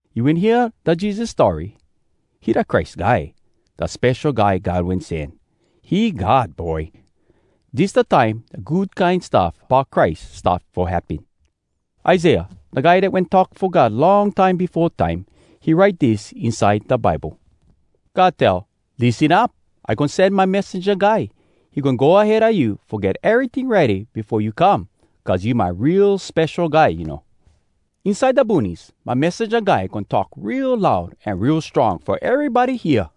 You wen hear da Jesus story? He da Christ Guy, da Spesho Guy God Wen Sen. He God Boy. Dis da time da Good Kine Stuff Bout Christ start fo happen. Isaiah, da guy dat wen talk fo God long time befo time, he write dis inside da Bible: “God tell, lissen up! “I goin sen my messenja guy. He goin go ahead a you Fo get eryting ready Befo you come, Cuz you my real Spesho Guy, you know. Inside da boonies, My messenja guy goin talk real loud an real strong Fo erybody hear: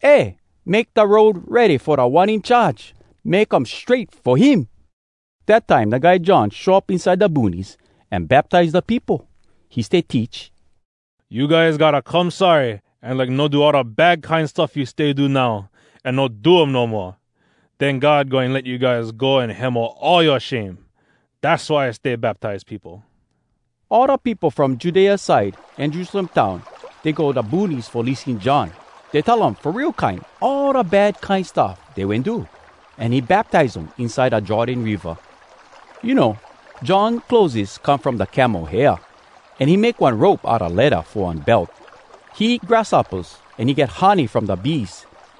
‘Eh! Make da road ready Fo Da One In Charge! Make um strait fo him!’” Dat time da guy John show up inside da boonies, an baptize da peopo. He stay teach, “You guys gotta come sorry an like no do all da bad kine stuff you stay do now, an no do um no moa. Den God goin let you guys go an hemo all yoa shame. Dass why I stay baptize peopo.” All da peopo from Judea side an Jerusalem town, dey go da boonies fo lissen John. Dey tell um fo real kine all da bad kine stuff dey wen do, an he baptize um inside da Jordan Riva. You know, John clotheses come from da camel hair, an he make one rope outa ledda fo one belt. He eat grasshoppas, an he get honey from da bees.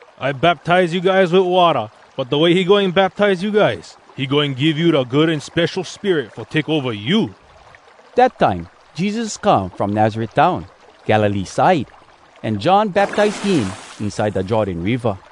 I baptize you guys wit watta, but da way he goin baptize you guys, he goin give you da Good An Spesho Spirit fo take ova you.” Dat time, Jesus come from Nazaret town, Galilee side, an John baptize him inside da Jordan Riva.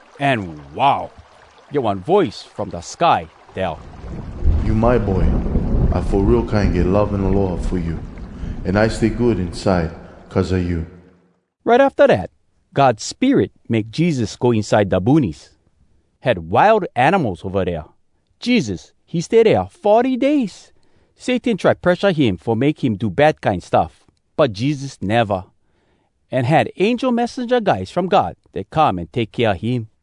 An wow! Get one voice from da sky tell, “You my boy! I fo real kine get love an aloha fo you, an I stay good inside cuz a you!” Right afta dat, God Spirit make Jesus go inside da boonies. Had wild animals ova dea. Jesus, he stay dea forty days. Satan try presha him fo make him do bad kine stuff, but Jesus neva. An had angel messenja guys from God dat come an take kea him.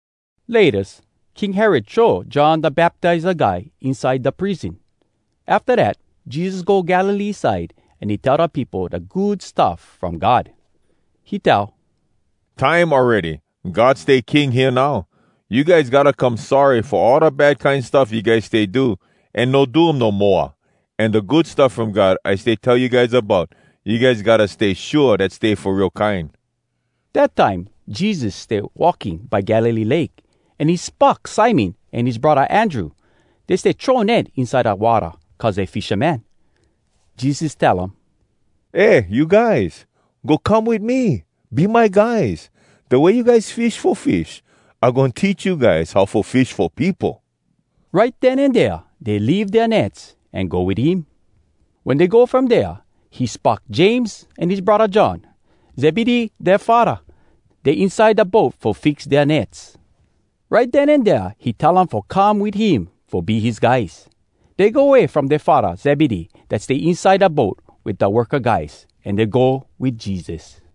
Laytas, King Herod throw John Da Baptiza Guy inside da prison. Afta dat, Jesus go Galilee side, an he tell da peopo da Good Stuff From God. He tell, “Time awready! God stay king hea now. You guys gotta come sorry fo all da bad kine stuff you guys stay do, an no do um no moa. An da Good Stuff From God I stay tell you guys about, you guys gotta stay shua dat stay fo real kine!” Dat time Jesus stay walking by Galilee Lake, an he spock Simon an his braddah Andrew. Dey stay throw net inside da watta, cuz dey fishamen. Jesus tell um, “Eh you guys! Go come wit me! Be my guys! Da way you guys fish fo fish, I goin teach you guys how fo fish fo peopo!” Right den an dea, dey leave dea nets an go wit him. Wen dey go from dea, he spock James an his braddah John. Zebedee dea faddah. Dey inside da boat fo fix dea nets. Right den an dea he tell um fo come wit him fo be his guys. Dey go way from dea faddah Zebedee dat stay inside da boat wit da worka guys, an dey go wit Jesus.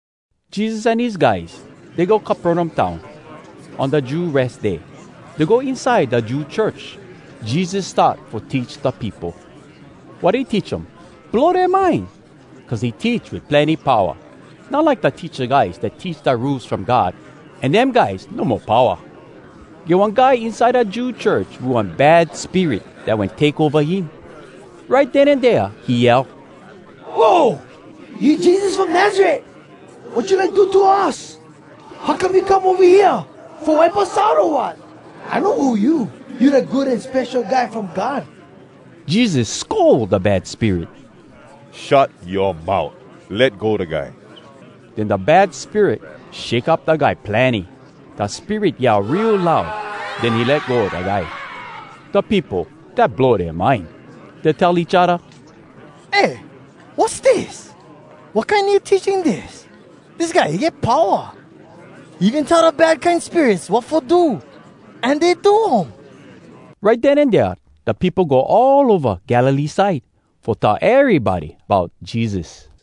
Jesus an his guys, dey go Capernaum town. On da Jew Res Day, dey go inside da Jew church. Jesus start fo teach da peopo. Wat he teach um blow dea mind! Cuz he teach wit plenny powa, not like da teacha guys dat teach da Rules From God, an dem guys no mo powa. Get one guy inside da Jew church wit one bad spirit dat wen take ova him. Right den an dea he yell, “Whoa! You Jesus from Nazaret! Wat you like do to us? How come you come ova hea? Fo wipe us out, o wat? I know who you! You da Good An Spesho Guy from God!” Jesus scold da bad spirit, “Shut yoa mout! Let go da guy!” Den da bad spirit shake up da guy plenny. Da spirit yell real loud. Den he let go da guy. Da peopo, dat blow dea mind. Dey tell each odda, “Eh! Wass dis?! Wat kine new teaching dis? Dis guy, he get powa! He even tell da bad kine spirits wat fo do, an dey do um!” Right den an dea, da peopo go all ova Galilee side, fo tell erybody bout Jesus.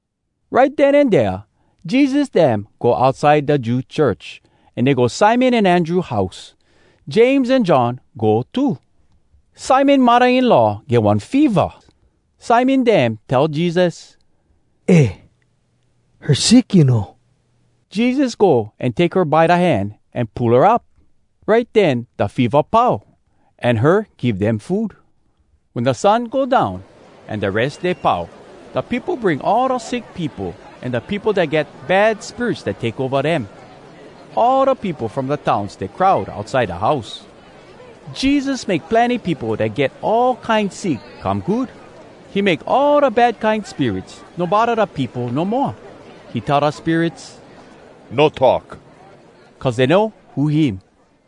Right den an dea Jesus dem go outside da Jew church, an dey go Simon an Andrew house. James an John go too. Simon muddah-in-law get one feva. Simon dem tell Jesus, “Eh, her sick, you know.” Jesus go an take her by da hand an pull her up. Right den da feva pau, an her give dem food. Wen da sun go down, an da Res Day pau, da peopo bring all da sick peopo an da peopo dat get bad spirits dat take ova dem. All da peopo from da town stay crowd outside da house. Jesus make plenny peopo dat get all kine sick come good. He make all da bad kine spirits no bodda da peopo no moa. He tell da spirits, “No talk!” cuz dey know who him.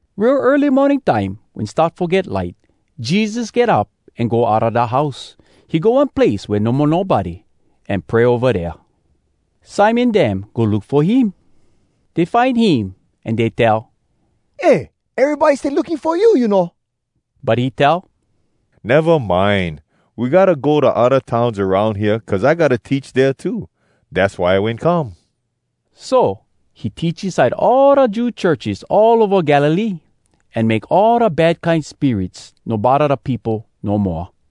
Real early morning time, wen start fo get light, Jesus get up an go outa da house. He go one place wea no mo nobody, an pray ova dea. Simon dem go look fo him. Dey find him, an dey tell, “Eh, erybody stay looking fo you, you know!” But he tell, “Neva mind! We gotta go da odda towns aroun hea, cuz I gotta teach dea too. Dass why I wen come.” So, he teach inside all da Jew churches all ova Galilee, an make all da bad kine spirits no bodda da peopo no moa.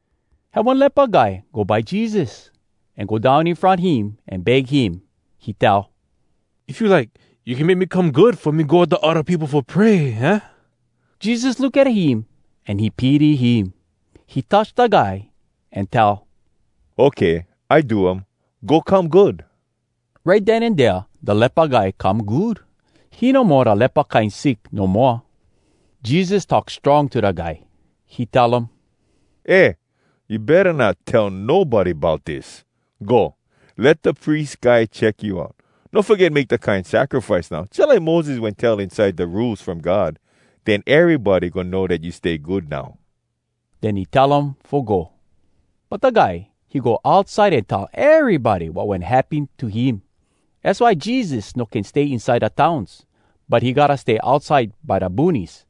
Had one lepa guy go by Jesus, an go down in front him an beg him. He tell, “If you like, you can make me come good fo me go wit da odda peopo fo pray, aah?” Jesus look at him, an he pity him. He touch da guy, an tell, “Okay, I do um. Go come good.” Right den an dea da lepa guy come good. He no mo da lepa kine sick no moa! Jesus talk strong to da guy. He tell um, “Eh! You betta not tell nobody bout dis! Go, let da pries guy check you out. No foget make da kine sacrifice now, jalike Moses wen tell inside da Rules From God. Den erybody goin know dat you stay good now.” Den he tell um fo go. But da guy, he go outside an tell erybody wat wen happen to him. Az why Jesus no can stay inside da towns, but he gotta stay outside by da boonies.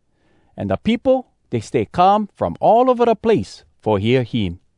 An da peopo, dey stay come from all ova da place fo hear him.